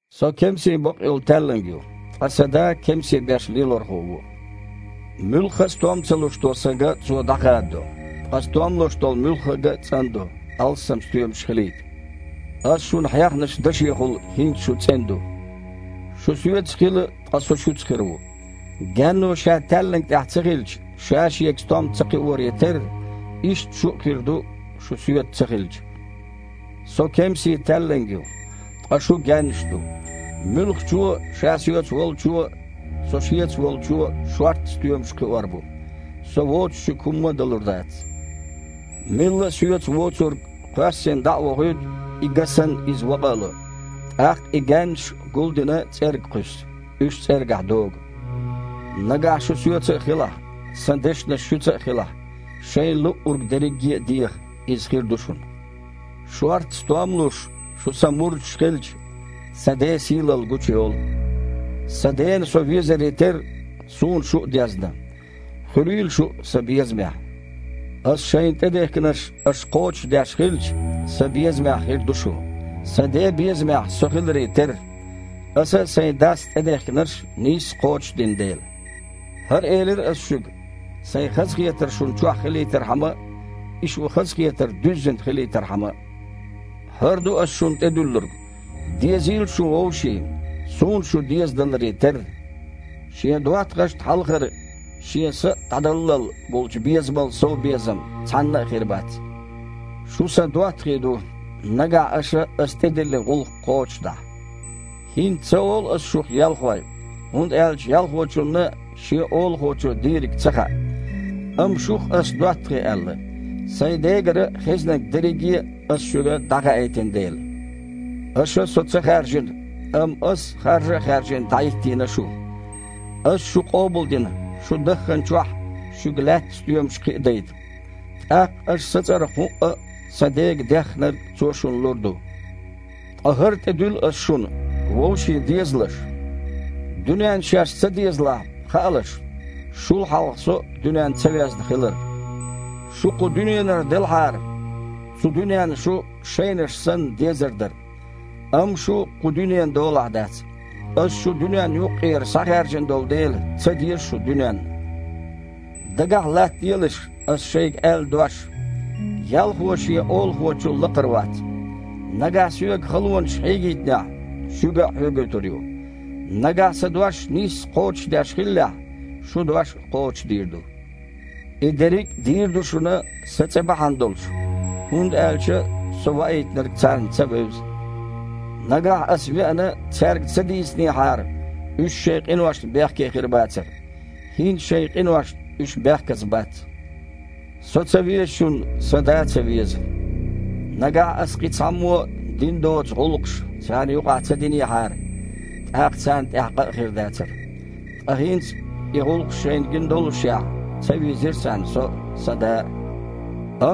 «Со кемсийн бакъйолу таьлланг ю, ткъа Сан Да кемсийн беш Лелорхо ву. Муьлхха а стом ца луш долу Сан га Цо дІахададо. Ткъа стом луш долу муьлхха а га цІандо, алссам стоьмаш хилийта. Ас шуна хьехначу дашехула хІинца шу цІена ду. Шу Соьца хила, ткъа Со Шуьца хир ву. Гаьнно, ша таьлланг тІехь ца хилча, ша-шегара стом ца кхиоре терра, иштта шу а хир ду, шу Соьца ца хилча. Со кемсийн таьлланг ю, ткъа шу гаьннаш ду. Муьлххачо а ша Соьца волчо а, Со шеца волчо а шортта стоьмаш кхиор бу. Со воцуш шуьга хІумма а далур дац. Милла а Соьца воцург кхоьссина дІа а вохуьйту, и га санна, иза вакъа а ло. ТІаккха и гаьннаш, гулдина, цІерга кхуьссу. Уьш цІергахь догу. Нагахь шу Соьца а хилахь, Сан дешнаш шуьца а хилахь, шайна луъург дерриге а деха, иза хир ду шуна. Шортта стом а луш, шу Сан мурдаш хилча, Сан Ден сийлалла гучуйолу. Сан Дена Со везаре терра, Суна шу а дезна. Хуьлийла шу а Сан безамехь. Аса шайна тІедехкинарш аша кхочушдеш хилча, Сан безамехь хир ду шу, Сан Ден безамехь Со хиларе терра, Аса а Сайн Дас тІедехкинарш нийсса кхочушдина дела. ХІара элира Ас шуьга, Сайн хазахетар шуна чохь хилийтархьама а, и шун хазахетар дуьззина хилийтархьама а. ХІара ду Ас шуна тІедуьллург: „Дезийла шуна вовшийн, Суна шу дезадаларе терра“. Шен доттагІашна хьалхара шен са а дІадаллал болчу безамал сов безам цхьанна а хир бац. Шу Сан доттагІий ду, нагахь аша Ас тІедиллина гІуллакх кхочушдахь. ХІинца ца олу Ас шух ялхой, хІунда аьлча ялхочунна шен олахочо дийриг ца хаьа. Амма шух Ас доттагІий аьлла, Сайн Дегара хезнарг дерриге а Ас шуьга дІахаийтина дела. Аша Со ца хаьржина, амма Ас, харжа а хаьржина, дІахІиттийна шу. Ас шу къобалдина, шу дахханчохь, шуьга лаьттан стоьмаш кхиадайта. ТІаккха аш Сан цІарах хІуъа а Сан Дега деххнарг Цо шуна лур ду. Ткъа хІара тІедуьллу Ас шуна: вовшийн дезалаш». «Дуьненна шаьш ца дезалахь, хаалаш, шул хьалха Со а дуьненна ца везна хилар. Шу кху дуьненара делахьара, цу дуьненна шу, шайнаш санна, дезар дара. Амма шу кху дуьненан долахь дац. Ас шу дуьненна юккъера схьахаьржина долу дела, ца деза шу дуьненна. Дагахь латтаделаш Аса шайга аьлла дош: „Ялхо шен олахочул лакхара вац“. Нагахь Соьга халонаш хьегийтинехь, шуьга а хьоьгуьйтур ю. Нагахь Сан дош нийсса кхочушдеш хиллехь, шун дош а кхочушдийр ду. И дерриг а дийр ду шуна Сан цІе бахьана долуш, хІунда аьлча Со Ваийтинарг царна ца вевза. Нагахь Аса, веана, цаьрга ца дийцинехьара, уьш шайн къиношна бехке хир бацара. ХІинца шайн къиношна уьш бехказа бац. Со ца везачунна Сан Да а ца веза. Нагахь Ас кхин цхьаммо а дина доцу гІуллакхаш царна юкъахь ца динехьара, тІаккха царна тІехь къа а хир дацара. Ткъа хІинца, и гІуллакхаш шайна гина доллушехь, ца вийзира царна Со а, Сан Да а.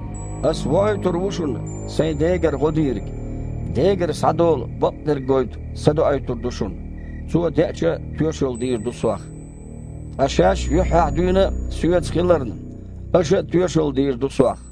Ас воуьйтур ву шуна Сайн Дегара гІо Дийриг – Дегара схьадолу бакъдерг гойту Са доуьйтур ду шуна. Цо, деача, тоьшалла дийр ду Сох. Ткъа шаьш юьххьехь дуьйна а Соьца хиларна, аша а тоьшалла дийр ду Сох».